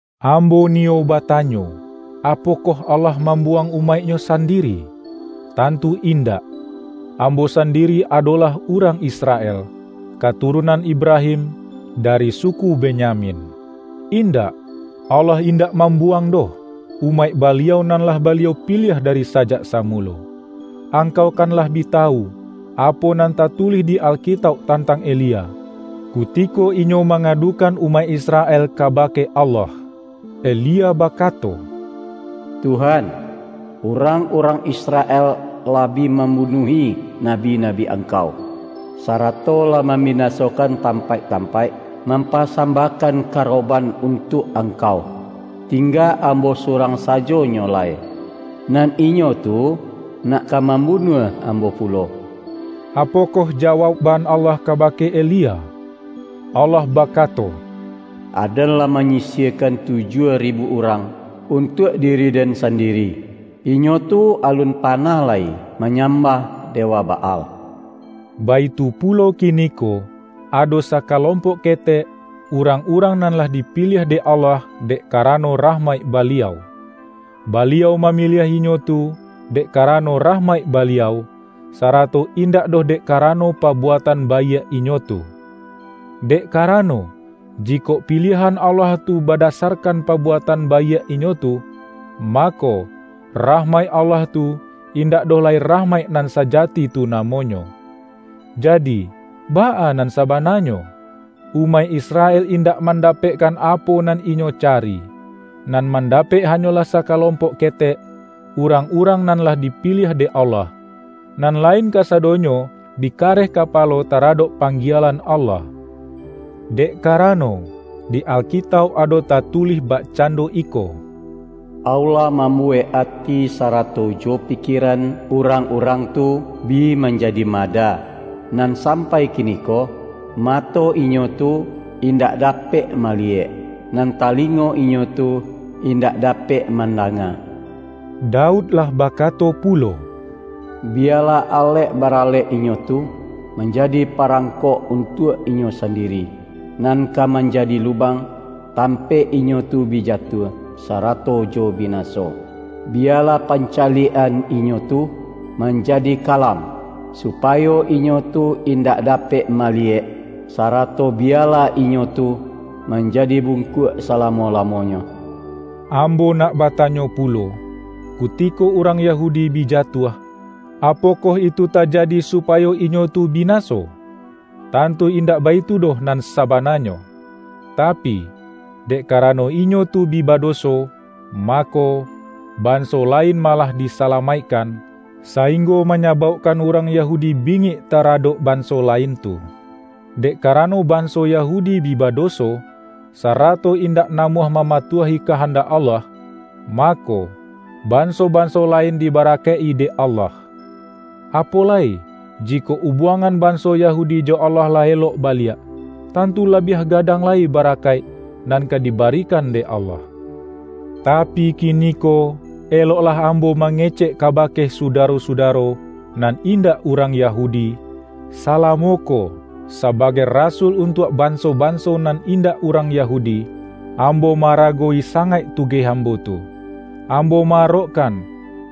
Ambo niyo batanyo: Apokoh Allah mambuwang umaik-Nyo sandiri? Tantu indak! Ambo sandiri adolah urang Israel, katurunan Ibrahim, dari suku Benyamin. Indak! Allah indak mambuwang doh, umaik Baliau nan lah Baliau piliah dari sajak samulo. Angkau kan lah bi tawu, apo nan tatulih di Alkitauk tantang Elia, kutiko inyo mangadukan umaik Israel kabake Allah. Elia bakato, ”Tuhan, urang-urang Israel lah bi mambunuahi nabi-nabi Angkau, sarato lah mambinasokan tampaik-tampaik mampasambahkan karoban untuak Angkau. Tingga ambo surang sajonyo lai, nan inyo tu nak ka mambunuah ambo pulo.” Apokoh jawaukban Allah kabake Elia? Allah bakato,”Aden lah manyisiahkan tujuah ribu urang, untuak diri-Den sandiri. Inyo tu alun panah lai manyambah dewa Baal.” Baitu pulo kiniko: Ado sakalompok ketek, urang-urang nan lah dipiliah dek Allah dek karano rahmaik Baliau. Baliau mamiliah inyo tu dek karano rahmaik Baliau, sarato indak doh dek karano pabuatan baiak inyo tu. Dek karano, jikok piliahan Allah tu badasarkan pabuatan baiak inyo tu, mako, rahmaik Allah tu, indak doh lai rahmaik nan sajati tu namonyo. Jadi, baa nan sabananyo? Umaik Israel indak mandapekkan apo nan inyo cari. Nan mandapek hanyolah sakalompok ketek, urang-urang nan lah dipiliah dek Allah. Nan lain kasadonyo bi kareh kapalo taradok panggielan Allah. Dek karano, di Alkitauk ado tatulih bakcando iko,”Allah mambuwek ati sarato jo pikieran urang-urang tu, bi manjadi mada; nan sampai kiniko, mato inyo tu indak dapek maliyek, nan talingo inyo tu indak dapek mandanga.” Daud lah bakato pulo,”Biyalah alek baralek inyo tu, manjadi parangkok untuak inyo sandiri, nan ka manjadi lubang, tampaik inyo tu bi jatuah, sarato jo binaso! Biyalah pancaliak-an inyo tu manjadi kalam, supayo inyo tu indak dapek maliyek; sarato biyalah inyo tu manjadi bungkuak salamo-lamonyo.” Ambo nak batanyo pulo: Kutiko urang Yahudi bi jatuah, apokoh itu tajadi supayo inyo tu binaso? Tantu indak baitu doh nan sabananyo! Tapi, dek karano inyo tu bi badoso, mako, banso lain malah disalamaikkan, sainggo manyabaukkan urang Yahudi bingik taradok banso lain tu. Dek karano banso Yahudi bi badoso, sarato indak namuah mamatuahi kahandak Allah, mako, banso-banso lain dibarakaik-i dek Allah. Apo lai, jikok ubuangan banso Yahudi jo Allah lah elok baliak; tantu labiah gadang lai barakaik, nan ka dibarikan dek Allah! Tapi kiniko, eloklah ambo mangecek kabake sudaro-sudaro, nan indak urang Yahudi! Salamo ko, sabagai rasul untuak banso-banso nan indak urang Yahudi, ambo ma-aragowi sangaik tugeh ambo tu. Ambo ma-arokkan,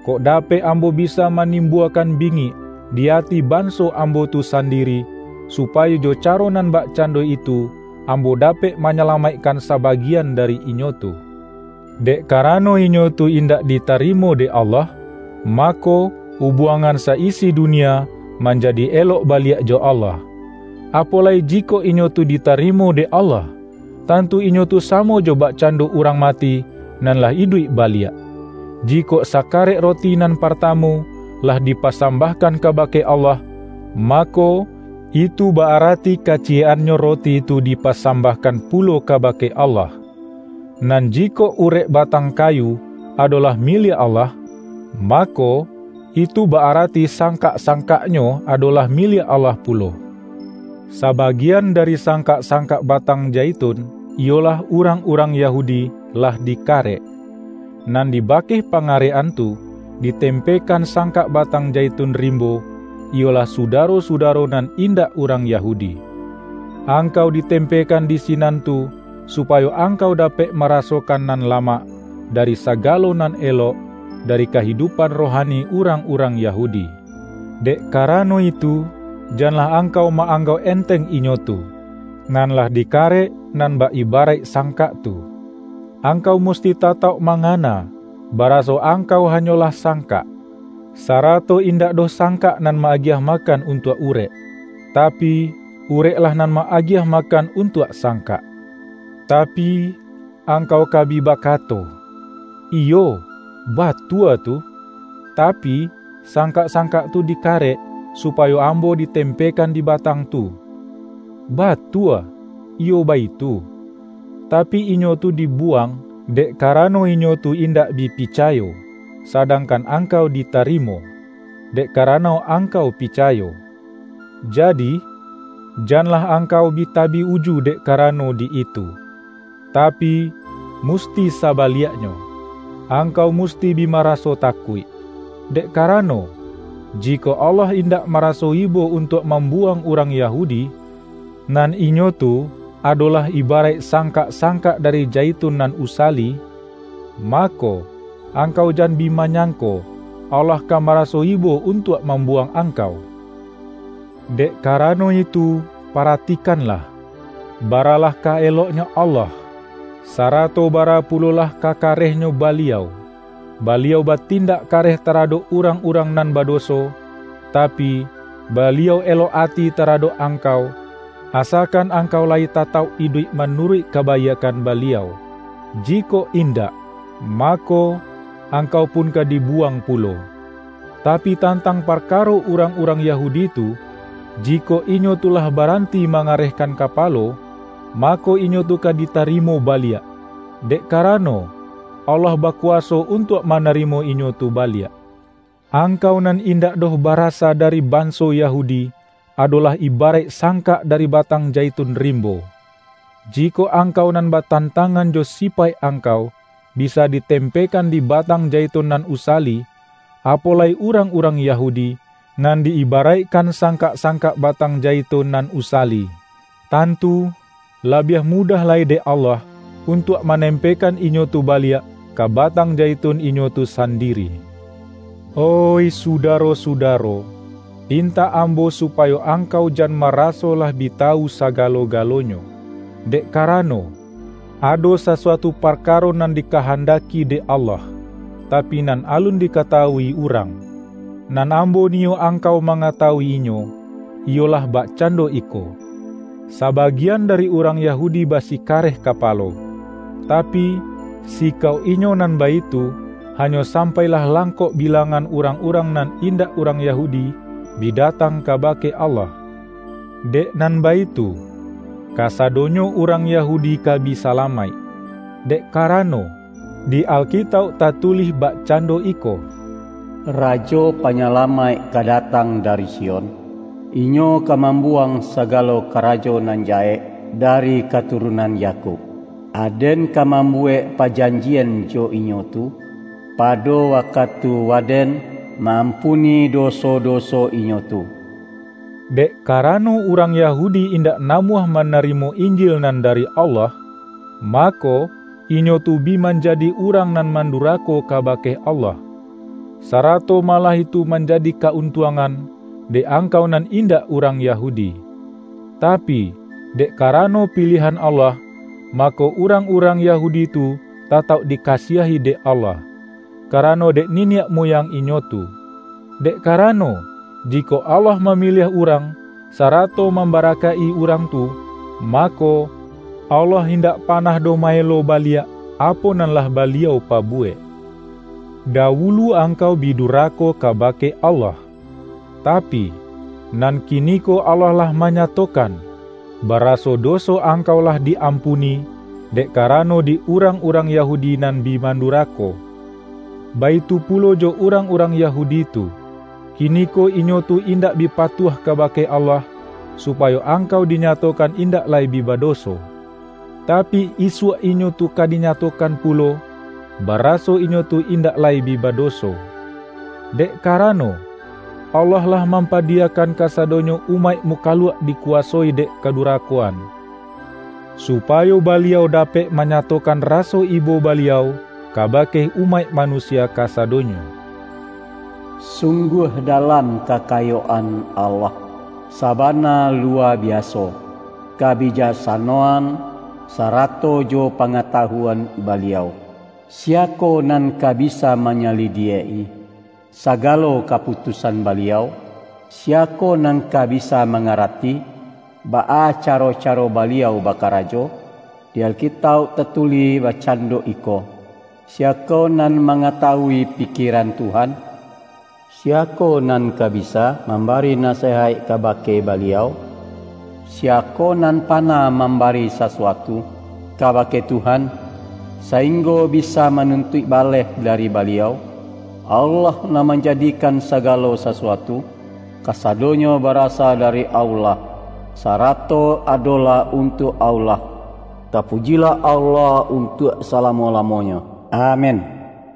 kok dapek ambo bisa manimbuakan bingik, di ati banso ambo tu sandiri, supayo jo caro nan bakcando itu, ambo dapek manyalamaikkan sabagian dari inyo tu. Dek karano inyo tu indak ditarimo dek Allah, mako, ubuangan sa-isi dunia, manjadi elok baliak jo Allah; apo lai jikok inyo tu ditarimo dek Allah! Tantu inyo tu samo jo bakcando urang mati, nan lah iduik baliak! Jikok sakarek roti nan partamu, lah dipasambahkan kabake Allah, mako, itu ba-arati kaciyek-annyo roti tu dipasambahkan pulo kabake Allah. Nan jikok urek batang kayu, adolah miliak Allah, mako, itu ba-arati sangkak-sangkaknyo adolah miliak Allah pulo. Sabagian dari sangkak-sangkak batang jaitun - iyolah urang-urang Yahudi - lah dikarek. Nan dibakeh pangarek-an tu, ditempekan sangkak batang jaitun rimbo, iyolah sudaro-sudaro nan indak urang Yahudi. Angkau ditempekan di sinan tu, supayo angkau dapek marasokan nan lamak, dari sagalo nan elok, dari kahidupan rohani urang-urang Yahudi. Dek karano itu, janlah angkau ma-anggauk enteng inyo tu, nan lah dikarek nan bak ibaraik sangkak tu. Angkau musti tatauk mangana, baraso angkau hanyolah sangkak. Sarato indak doh sangkak nan ma-agiah makan untuak urek, tapi, ureklah nan ma-agiah makan untuak sangkak. Tapi, angkau ka bi bakato,”Iyo, batua tu, tapi, sangkak-sangkak tu dikarek, supayo ambo ditempekan di batang tu!” Batua, iyo baitu. Tapi, inyo tu dibuwang, dek karano inyo tu indak bi picayo, sadangkan angkau ditarimo, dek karano angkau picayo. Jadi, janlah angkau bi tabik uju dek karano di itu; tapi, musti sabaliaknyo, angkau musti bi maraso takuik. Dek karano, jikok Allah indak maraso ibo untuak mambuwang urang Yahudi, nan inyo tu adolah ibaraik sangkak-sangkak dari jaitun nan usali, mako, angkau jan bi manyangko Allah ka maraso ibo untuak mambuwang angkau! Dek karano itu paratikanlah, baralah ka-eloknyo Allah, sarato bara pulolah ka karehnyo Baliau. Baliau batindak kareh taradok urang-urang nan badoso, tapi, Baliau elok ati taradok angkau - asakan angkau layi tatauk iduik manuruik kabaiakkan Baliau. Jikok indak, mako, angkau pun ka dibuwang pulo. Tapi, tantang parkaro urang-urang Yahudi tu, jikok inyo tu lah baranti mangarehkan kapalo, mako, inyo tu ka ditarimo baliak; dek karano, Allah bakuwaso untuak manarimo inyo tu baliak. Angkau nan indak doh barasa dari banso Yahudi, adolah ibaraik sangkak dari batang jaitun rimbo. Jikok angkau nan batantangan jo sipaik angkau, bisa ditempekan di batang jaitun nan usali, apo lai urang-urang Yahudi, nan di-ibaraikkan sangkak-sangkak batang jaitun nan usali. Tantu labiah mudah lai dek Allah, untuak manempekan inyo tu baliak, ka batang jaitun inyo tu sandiri. Oih sudaro-sudaro! Pintak ambo supayo angkau jan maraso lah bi tawu sagalo-galonyo. Dek karano, ado sasuatu parkaro nan dikahandaki dek Allah, tapi nan alun dikatawui urang. Nan ambo niyo angkau mangatawu-inyo; iyolah bakcando iko: Sabagian dari urang Yahudi basikareh kapalo, tapi, sikauk inyo nan baitu, hanyo sampai lah langkok bilangan urang-urang nan indak urang Yahudi, bi datang kabake Allah. Dek nan baitu, kasadonyo urang Yahudi ka bi salamaik. Dek karano, di Alkitauk tatulih bakcando iko,”Rajo Panyalamaik ka datang dari Sion; Inyo ka mambuwang sagalo karajo nan jahek dari katurunan Yakub. Aden ka mambuwek pajanjian jo inyo tu, pado wakatu Waden ma-ampuni doso-doso inyo tu.” Dek karano urang Yahudi indak namuah manarimo Injil nan dari Allah, mako, inyo tu bi manjadi urang nan mandurako kabake Allah; sarato malah itu manjadi ka-untuangan, dek angkau nan indak urang Yahudi. Tapi, dek karano piliahan Allah, mako, urang-urang Yahudi tu tatauk dikasiahi dek Allah, karano dek niniak muyang inyo tu. Dek karano, jikok Allah mamiliah urang, sarato mambarakaik-i urang tu, mako, Allah indak panah doh ma-elo baliak, apo nan lah Baliau pabuwek. Dawulu angkau bi durako kabake Allah. Tapi, nan kiniko Allah lah manyatokan, baraso doso angkau lah di-ampuni, dek karano di urang-urang Yahudi nan bi mandurako. Baitu pulo jo urang-urang Yahudi tu. Kiniko inyo tu indak bi patuah kabake Allah, supayo angkau dinyatokan indak lai bi badoso. Tapi, isuak inyo tu ka dinyatokan pulo, baraso inyo tu indak lai bi badoso. Dek karano, Allah lah mampadiyakan kasadonyo umaik mukaluak dikuwasoi dek kadurakoan, supayo Baliau dapek manyatokan raso ibo Baliau, kabake umaik manusia kasadonyo. Sungguah dalam kakayoan Allah! Sabana luwa biaso, kabijaksanoan, sarato jo pangatawuan Baliau! Siyakoh nan ka bisa manyalidiak-i sagalo kaputusan Baliau? Siyakoh nan ka bisa mangarati, baa caro-caro Baliau bakarajo? Di Alkitauk tatulih bakcando iko,”Siyakoh nan mangatawui pikieran Tuhan? Siyakoh nan ka bisa mambari nasiyaik kabake Baliau? Siyakoh nan panah mambari sasuatu kabake Tuhan, sainggo bisa manuntuik baleh dari Baliau?" Allah nan manjadikan sagalo sasuatu. Kasadonyo barasa dari Allah, sarato adolah untuak Allah. Tapujilah Allah untuak salamo-lamonyo! Amin. ROMA